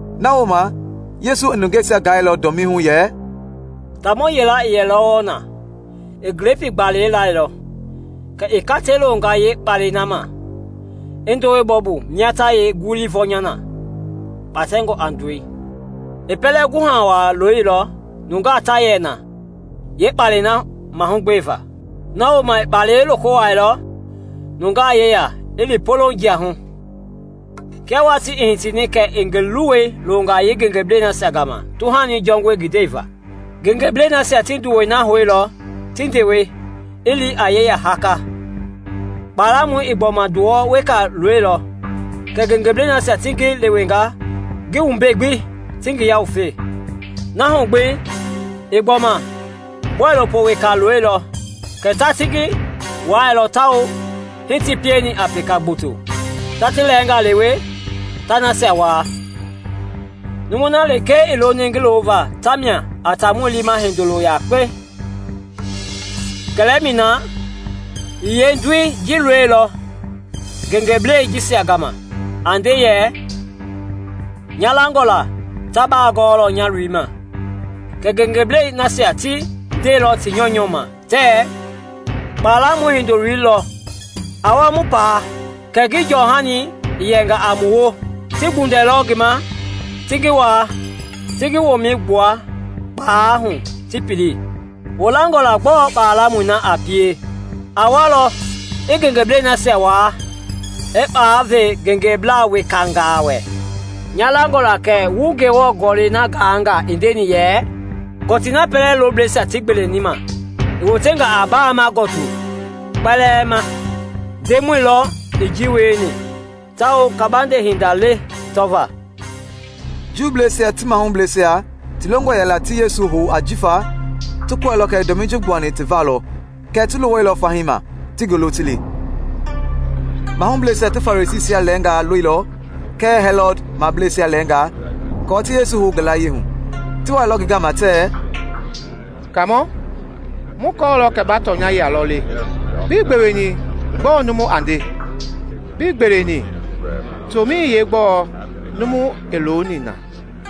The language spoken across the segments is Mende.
Na wooma, Yesu i nungeisia gailɔ dɔmii hu yɛ, “Taamɔ yila i yɛlɔ wɔɔ na. I glepii gbalei lailɔ, kɛ i katei loonga yeekpalɛi ma, i ndowei bɔ mia ta yeenguɛi vɔnya na ta kpatɛ a ndɔi. I pɛlɛ guha waa looilɔ nungaa ta yɛ na yeekpalɛi mahugbe va. Na wooma i kpalɛi loko wuailɔ nungaa yeya i li poloŋ jia hu. Kia watii i hitini kɛ i ngi luwɔi loonga yeengengebleisia gama tuhani jɔngɔi ngi ndɛi va. Ngengebleisia ti nduwɔi na houilɔ, ti ndewe, i li a yeya haka. Kpalamɔi i gbɔma nduwɔ weka loilɔ, kɛɛ ngengebleisia ti ngi leweilɔ ngi wumbei gbi, ti ngi yawufe. Na hu gbi i gbɔma bɔilopo weka loilɔ kɛɛ ta ti ngi wailɔ tawao hii ti pieni a peka gboto, ta ti lɛɛngaa lewe, ta nasia waa. Numui na lekee i loni ngi loova tamia a taamɔi liima hindolo yakpei. Kɛlɛmɛi na, i yeendoi ji loilɔ ngengeblɛi jisia gama, a nde yɛ, ‘Nya langɔ la ta ba gɔɔlɔ nya loi ma.’ Kɛɛ ngengeblɛi nasia ti ndeilɔ ti nyɔunyɔ ma tɛɛ, ‘Kpalamɔi hindoloi lɔ. A wa mu paa, kɛ ngi jɔhani i yɛnga a mu woo!’ Ti gbundɛilɔ ngi ma, ti ngi waa, ti ngi womɛi gbua kpalɛi hu, ti pili. “Wu langɔ la gbɔɔ kpalamɔi na a pie? A walɔ, i ngengeblɛi nasia waa, i kpalɛi ve ngengeblaa wekangaa wɛ. Nya langɔ la kɛ wu Ngewɔ Gɔlɛi na gaanga i ndeni yɛ, ‘Kɔtii na pɛlɛ loblɛisia ti gbeleni ma, i wotenga a baama gɔtu kɔtii kpɛlɛɛ ma. Ndemɔi lɔ i ji wieni tawao kabande hinda le tɔvaa!’” Juubleisia ti mahubleisia ti longɔ yɛla ti Yesu hou ajifa ti kɔɛilɔ kɛ i dɔmii ji gbuani ti va lɔ kɛɛ ti luwailɔ fahii ma, ti ngi lo ti li. Mahubleisia ti Farisiisia lɛɛngaa loilɔ kɛɛ Hɛlɔd mableisia lɛɛngaa aako ti Yesu hou ngi layie hu. Ti wailɔ ngi gama tɛɛ, “Kaamɔ, mu kɔɔlɔ kɛ ba tɔnyɛi lɔ le, bii gbeweni gbɔɔ numu a nde. Bii gbeweni tomɛi yeegbɔɔ numu i looni na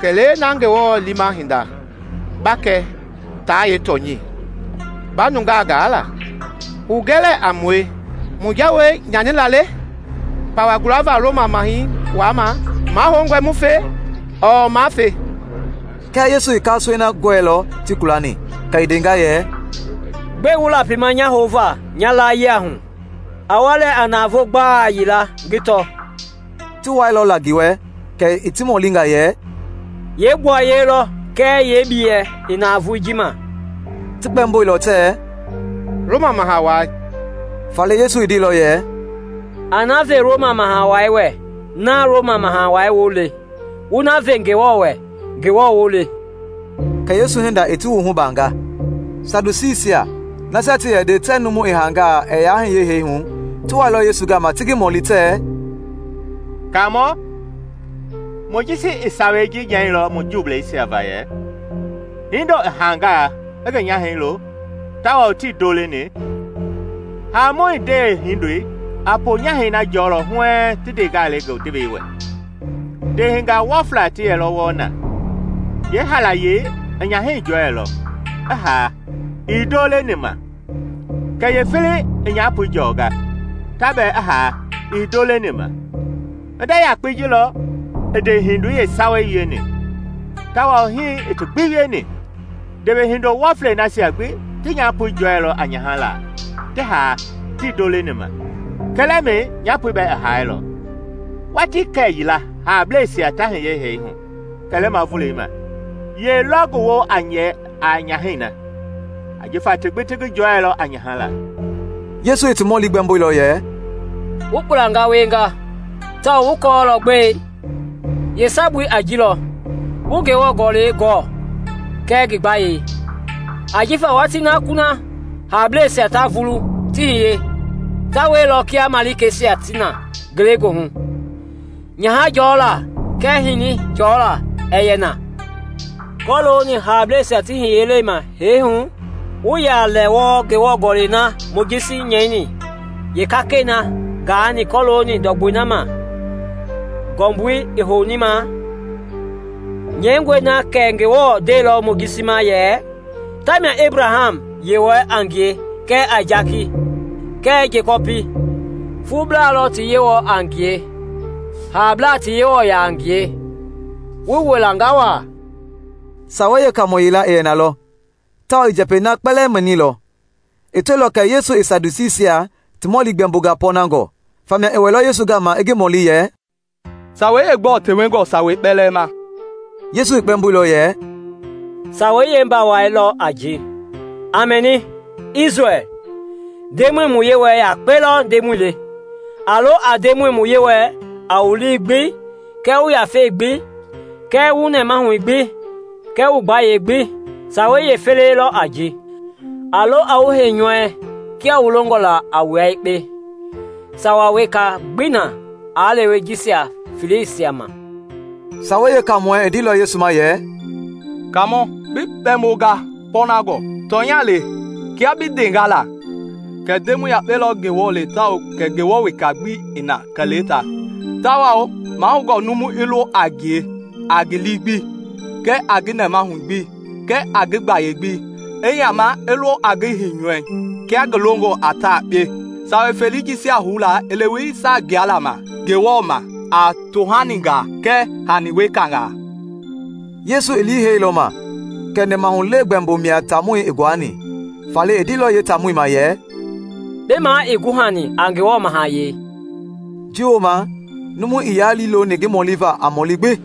kɛlee na Ngewɔ liima hindei ba kɛ taa yeetɔnyɛi ba nungaa gaala. Hugɛ lɛɛ a mue, mu jawei nyanila le pawa gulava Roma Maha Wai ma? Mahoungɔe mu fe ɔɔ maa fe?” Kɛɛ Yesu i kasoei na gɔɛilɔ ti kulani, kɛ i ndenga yɛ, “Gbɛe wu lapima nya houva nya layie hu? A wa lɛɛ a navoo gbala yila, ngi tɔ.” Ti wailɔ la ngi wɛ kɛ i ti mɔlinga yɛ, “Yee gbuaye lɔ kɛɛ ngi biyei i navoei ji ma?” Ti kpɛmboilɔ tɛɛ, “Roma Maha Wai.” Faale Yesu i ndeilɔ yɛ, “A na ve Roma Maha Wai wɛ Roma Maha Wai woo le, wu na ve Ngewɔ wɛ Ngewɔ woo le.” Kɛ Yesu hinda i ti wuhu baanga. Sadusiisia, nasia ti yɛ nde tɛɛ numu i haangaa ɛɛ yaa hiye hee hu, ti wailɔ Yesu gama ti ngi mɔli tɛɛ, “Kaamɔ, Mojisi i sawei ji nyɛilɔ mu Juubleisia va yɛ, ‘Hindo i haangaa i ngi nyahɛi lo tawao tii ndo leni, haamɔi ndewehindoi a ponyahɛi na jɔlɔ huɛɛŋ ti ndeengaa le ngi ndewei wɛ.’ Ndeehingaa wɔfla ti yɛlɔ wɔɔ na; yeehalayei i nyahɛi jɔɛilɔ, i haa, ii ndo leni ma. Kɛ yeefelei i nyapoi jɔnga, ta bɛɛ i haa ii ndo leni ma. Hinda yakpei ji lɔ i ndeehindoi yeesawei wieni, tawao hii i ti gbi wieni; ndewehindo wɔflei nasia gbi ti nyapoi jɔɛilɔ a nyaha laa, ti haa, tii ndo leni ma. Kɛlɛmɛi nyapoi bɛɛ i haailɔ. Watii kɛyila haableisia ta hiye hee hu kɛlɛma volei ma, yɛ lɔ ngi woo a yɛ a nyahɛi na, jifa ti gbi ti ngi jɔɛilɔ a nyaha la?” Yesu i ti mɔli gbɛmboilɔ yɛ, “Wu kpulanga wienga! Tawao wu kɔɔlɔ gbɛe? Yeesabui a ji lɔ wuii Ngewɔ Gɔlɛi gɔɔ kɛɛ ngi gbayei. Ajifa watii na kuna haableisia ta vulu ti hiye, ta wielɔ kia malikeisia ti na ngelegoohu, nyaha jɔla kɛɛ hini jɔla ɛɛ yɛ na. Kɔlooni haableisia ti hiyelei ma hee hu, wuii yaa lɛ wɔɔ Ngewɔ Gɔlɛi na Mojisi nyɛini yeekakɛi na gaani kɔlooni ndɔgbɔi na ma ngɔmbui i houni ma? Nyɛingɔe na kɛ Ngewɔ ndeilɔ Mojisi ma yɛ, ‘Tamia Ebraham Yewɔɛi a ngie kɛɛ Aisaki kɛɛ Jekɔpi.’ Fuublaa lɔ ti Yewɔ a ngie, haablaa ti Yewɔ ya a ngie. Wu wɔlanga wa!” Sawei Yeekaamɔ yila i yɛ na lɔ, tawao i njɛpɛi na kpɛlɛɛ mɛnilɔ. I tɔilɔ kɛ Yesu i Sadusiisia ti mɔli gbɛmbonga pɔɔnangɔ, famia i wɛilɔ Yesu gama i ngi mɔli yɛ, “Sawei yeegbɔɔ tewengɔ sawei kpɛlɛɛ ma?” Yesu i kpɛmboilɔ yɛ, “Sawei yeembawai lɔ a ji: ‘A mɛni, Isrɛl! Ndemɔi mu Yewɔɛi yakpe lɔ Ndemɔi le. A lo a Ndemɔi wu Yewɔɛi a wu lii gbi kɛɛ wu yafei gbi kɛɛ wu nɛmahui gbi kɛɛ wu gbayei gbi.’ Sawei yeefelei lɔ a ji: ‘A lo a wu heinyɔui kia wu longɔ la a wua yekpe.’ Sawa weka gbii na aa lewe jisia feleisia ma.” Sawei Yeekaamɔi i ndeilɔ Yesu ma yɛ, “Kaamɔ, bi kpɛmbonga pɔɔnangɔ! Tɔnya le, kia bi ndenga la, kɛ Ndemɔi yakpe lɔ Ngewɔ le tawao kɛ Ngewɔ weka ii na kɛlee ta. Tawao mahoungɔ numu i lo a ngie a ngi lii gbi, kɛɛ ngi nɛmahui gbi, kɛɛ ngi gbayei gbi; i yama i lo a ngi heinyɔui kia ngi longɔ a ta yekpe. Sawa felei jisia houla i leweni saa gbuala ma Ngewɔ ma a tohaningaa kɛɛ hani wekanga.” Yesu i liiheilɔ ma kɛ nɛmahulewe gbɛmbo mia taamɔi i nguani, faale i ndeilɔ yeetaamɔi ma yɛ, “Bi ma ii guhani a Ngewɔ mahayɛi.” Ji wooma numu ii yaa liiloni ngi mɔliva a mɔɔli gbi.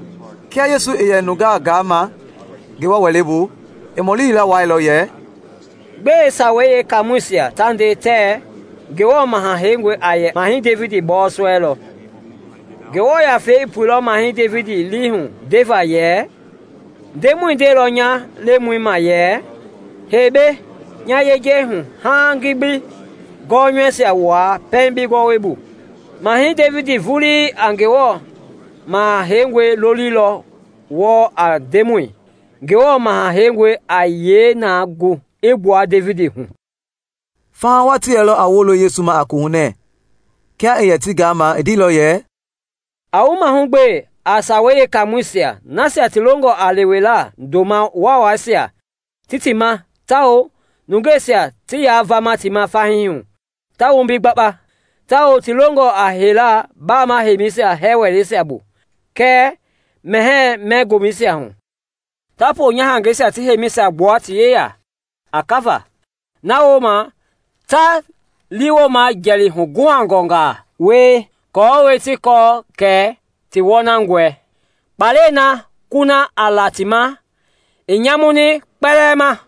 Kia Yesu i yɛ nungaa gaama Ngewɔ Wɛlei bu, i mɔli yila wuailɔ yɛ, “Gbɛe Sawei Yeekaamɔisia ta nde tɛɛ Ngewɔ Maha Heingɔi a yɛ a Mahɛi Devidi bɔɔsɔ lɔ? Ngewɔ Yafei i puilɔ Mahɛi Devidi lii hu ndeva yɛ, ‘Ndemɔi ndeilɔ nya Lemɔi ma yɛ, Hei mbei nya yejei hu haaŋ ngi bi gɔnyɔuisia wua pɛiŋ bi gɔwɔbu.’ Mahɛi Devidi vulii a Ngewɔ Maha Heingɔi loli wɔɔ a Ndemɔi; Ngewɔ Maha Heingɔi a yee na gu i gbua Devidi hu?” Faha wa ti yɛlɔ a wolo Yesu ma a kohunɛ. Kia i yɛ ti gaama i ndeilɔ yɛ, “A wu mahugbe a Sawei Yeekaamɔisia, nasia ti longɔ a lewela ndoma waawaisia ti ti ma tawao nungeisia ti yaa vama ti ma fahii hu ta wombi gbakpa, tawao ti longɔ a heila baama heimisia hɛɛ wɛleisia bu kɛɛ mɛhɛɛ-mɛ gomɛisia hu. Ta ponyahangɛisia ti heimisia gbua ti yeya a kava, na wooma ta liiwooma jɛli huguhangɔngaa wie aako ti kɛ kɛ ti wɔnangɔe. Kpalɛi na kuna a la ti ma i nyamuni kpɛlɛɛ ma!”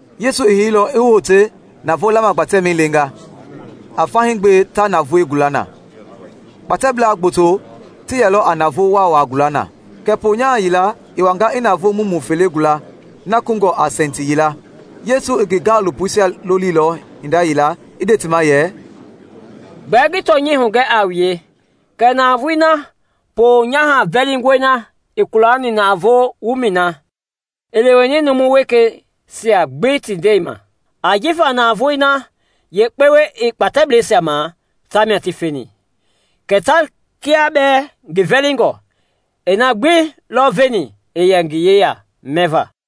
Yesu i heilɔ i wote navoo lamagbatɛmɛi leenga, a fahii gbe ta navoei gula na. Kpatɛblaa gboto ti yɛlɔ a navoo waawaa gula na. Kɛ ponyaha yila i wanga i navoo mumu fele gula na kungɔ a sɛnti yila. Yesu i ngi gaalopoisia lolilɔ hinda yila i nde ti ma yɛ, “Gbɛɛ ngi tɔnyɛi hugɛ a wue kɛ navoei na ponyaha vɛlingɔi na i kulani navoo wumɛi na, i leweni numu wekeisia gbi ti ndɛi ma. Ajifa navoei na yeekpewe ii kpatɛbleisia ma ta mia ti feni, kɛɛ ta, kia bɛɛ ngi vɛlingɔ, i na gbi lɔ veni i yɛ ngi yeya mɛva.”